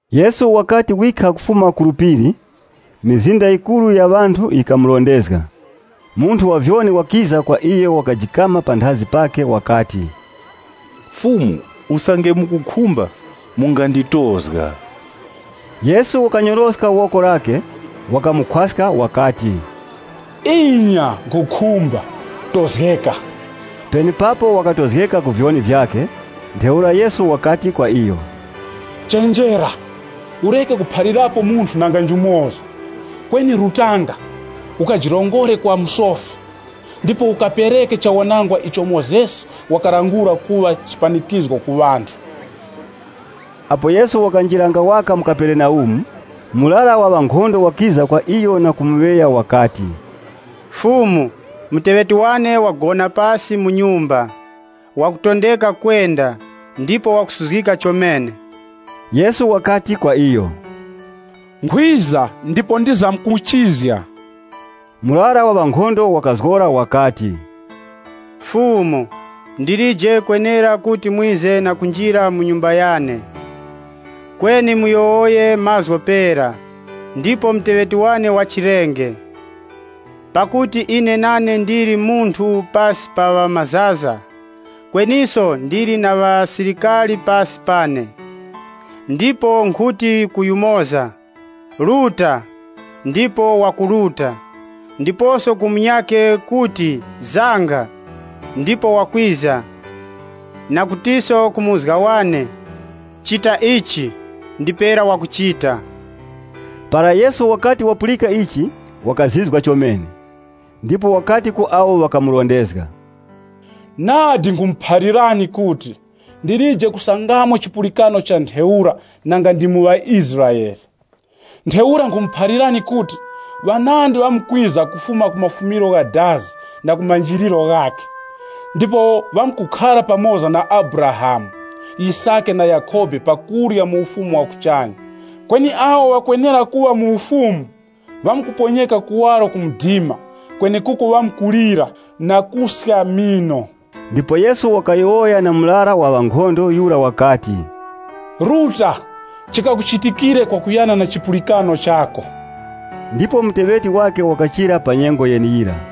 Yesu wakati wikha kufuma ku phiri, mizinda yikuru yikamurondezga. Munthu wa vyoni wakiza kwa iyo wakajikama panthazi pakhe wakati, “Fumu, usange mukukhumba, munganditozga.” Yesu wakanyoroska woko lakhe, wakamukhwaska wakati, “Inya, nkhukhumba, tozgeka!” Penepapo wakatozgeka ku vyoni vyakhe. Ntheura Yesu wakati kwa iyo, “Chenjera, ureke kuphalirapo munthu nanga njumoza. Kweni rutanga, ukajirongore kwa musofi, ndipo ukapereke chawanangwa icho Mozesi wakalangula kuŵa chipanikizgo ku ŵanthu.” Apo Yesu wakanjiranga waka mu Kaperenaumu, murara wa ŵankhondo wakiza kwa iyo na kumuŵeya, wakati, “Fumu, muteŵeti wane wagona pasi mu nyumba, wakutondeka kwenda, ndipo wakusuzgika chomene.” Yesu wakati kwa iyo, “Nkhwiza ndipo ndizamkuchizga.” Murara wa ŵankhondo wakazgora wakati, “Fumu, ndilije kwenera kuti mwize na kunjira mu nyumba yane. Kweni muyowoye mazgu pera, ndipo muteŵeti wane wachirenge. Pakuti ine nane ndili munthu pasi pa ŵamazaza, kweniso ndili na ŵasilikari pasi pane. Ndipo nkhuti ku yumoza, ‘Ruta!’ Ndipo wakuruta. Ndiposo ku munyakhe kuti, ‘Zanga’ ndipo wakwiza, nakutiso ku muzga wane, ‘Chita ichi’ ndipera wakuchita.” Para Yesu wakati wapulika ichi, wakazizwa chomene, ndipo wakati ku awo ŵakamurondezga, “Nadi nkhumuphalirani kuti, ndilije kusangamo chipulikano cha ntheura nanga ndi mu ŵaIsraele. Ntheura nkhumuphalirani kuti, ŵanandi ŵamkwiza kufuma ku mafumiro gha dazi na ku manjiliro ghakhe, ndipo ŵamkukhara pa kurya pamoza na Abrahamu, Yisake na Yakhobe mu Ufumu wa kuchanya. Kweni awo ŵakwenera kuŵa mu Ufumu, ŵamkuponyeka kuwaro ku mdima kwenekuko ŵamkulira na kuska mino.” Ndipo Yesu wakayowoya na murara wa ŵankhondo yura wakati, “Ruta, chikakuchitikire kwakuyana na chipulikano chako.” Ndipo muteŵeti wakhe wakachira pa nyengo yeneyira.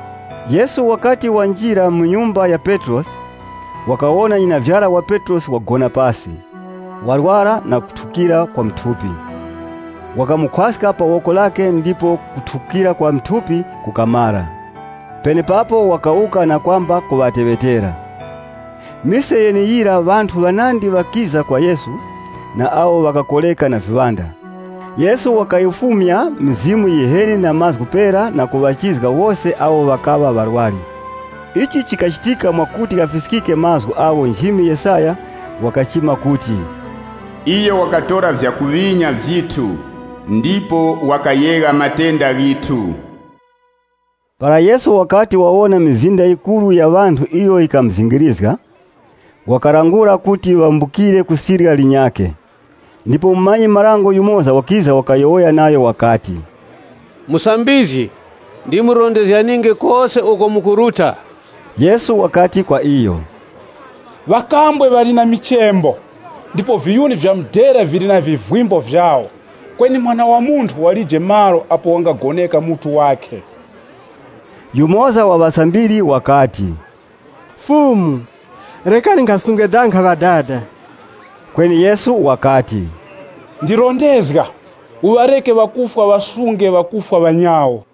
Yesu wakati wanjira mu nyumba ya Petrosi wakawona nyinavyara wa Petrosi wagona pasi, warwara na kuthukira kwa mu thupi. Wakamukhwaska pa woko lakhe ndipo kuthukira kwa mu thupi kukumara. Penepapo wakawuka na kwamba kuŵateŵetera. Mise yeneyira, ŵanthu ŵanandi ŵakiza kwa Yesu na awo ŵakakoreka na viŵanda. Yesu wakayifumya mizimu yiheni na mazgu pera na kuŵachizga wose awo ŵakaŵa ŵarwari. Ichi chikachitika mwakuti ghafiskike mazgu agho nchimi Yesaya wakachima kuti, “Iyo wakatora vyakuŵinya vyithu, ndipo wakayegha matenda ghithu.” Para Yesu wakati wawona mizinda yikuru ya ŵanthu iyo yikamuzingirizga, wakalangula kuti ŵambukire ku sirya linyakhe. Ndipo mumanyi-marango yumoza wakiza wakayowoya nayo wakati, “Musambizgi, ndimurondezganinge kose uko mukuruta.” Yesu wakati kwa iyo, “Ŵakambwe ŵali na michembo, ndipo viyuni vya mudera vili na vivimbo vyawo, kweni Mwana wa Munthu walije malo apo wangagoneka mutu wakhe.” Yumoza wa ŵasambiri wakati, “Fumu, rekani nkhasunge danga ŵadada.” Kweni Yesu wakati, “Ndirondezga, uŵareke ŵakufwa ŵasunge ŵakufwa ŵanyawo.”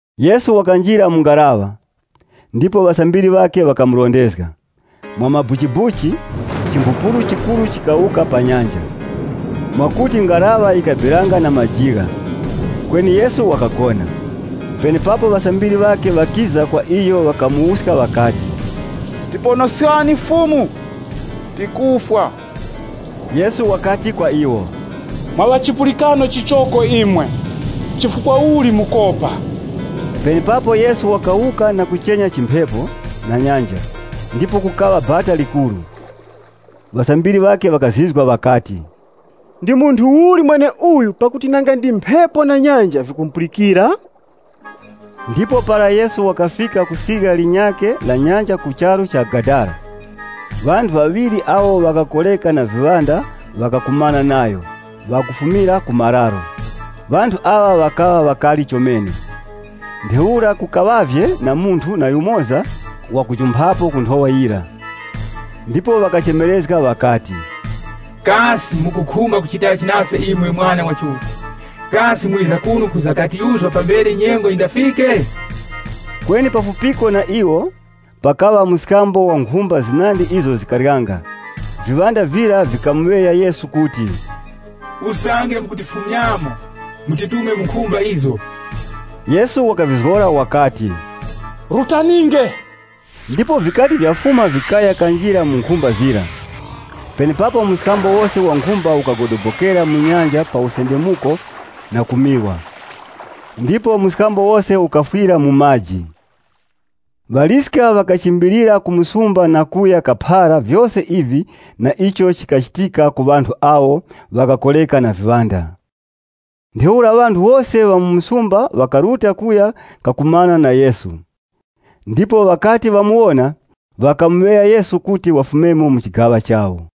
Yesu wakanjira mu ngaraŵa, ndipo ŵasambiri ŵakhe ŵakumurondezga. Mwamabuchibuchi, chimphupuru chikuru chikawuka pa nyanja, mwakuti ngaraŵa yikabiranga na majigha. Kweni Yesu wakagona. Penepapo ŵasambiri ŵakhe ŵakiza kwa iyo ŵakamuwuska ŵakati, “Tiponoskani, Fumu, tikufwa!” Yesu wakati kwa iwo, “Mwa ŵa chipulikano chichoko imwe, chifukwa uli mukopa?” Penepapo Yesu wakawuka na kuchenya chimphepo na nyanja. Ndipo kukaŵa bata likuru. Ŵasambiri ŵakhe ŵakazizwa ŵakati, “Ndi munthu uli mweneuyu pakuti nanga ndi mphepo na nyanja vikumupulikira?” Ndipo para Yesu wakafika ku sirya linyakhe la nyanja ku charu cha Gadara, ŵanthu ŵaŵiri awo ŵakakoreka na viŵanda ŵakakumana nayo, ŵakufumira ku mararo. Ŵanthu aŵa ŵakaŵa ŵakari chomene, ntheura kukaŵavye na munthu na yumoza wakujumphako ku nthowa yira. Ndipo ŵakachemerezga ŵakati, “Kasi mukukhumba kuchitachi nase imwe Mwana wa Chiuta? Kasi mwiza kuno kwiza katiyuzga pambere nyengo yindafike?” Kweni pafupiko na iwo, pakaŵa mskambo wa nkhumba zinandi izo zikaryanga. Mizimu yiheni yira yikamuŵeya Yesu kuti, “Usange mukutifumyamo, mutitume mu nkhumba izo.” Yesu wakayizgora wakati, “Rutaninge!” Ndipo yikati yafuma yikaya kanjira mu nkhumba zira. Penepapo mskambo wose wa nkhumba ukagodobokera mu nyanja pa usendemuko na kumirwa, ndipo mskambo wose ukafwira mu maji. Ŵaliska ŵakachimbilira ku msumba na kuya kaphara vyose ivi na icho chikachitika ku ŵanthu awo ŵakakoreka na mizimu yiheni. Penepapo ŵanthu wose ŵa mu msumba ŵakaruta kuya kakumana na Yesu. Ndipo ŵakati ŵamuwona, ŵakamuŵeya Yesu kuti wafumemo mu chigaŵa chawo.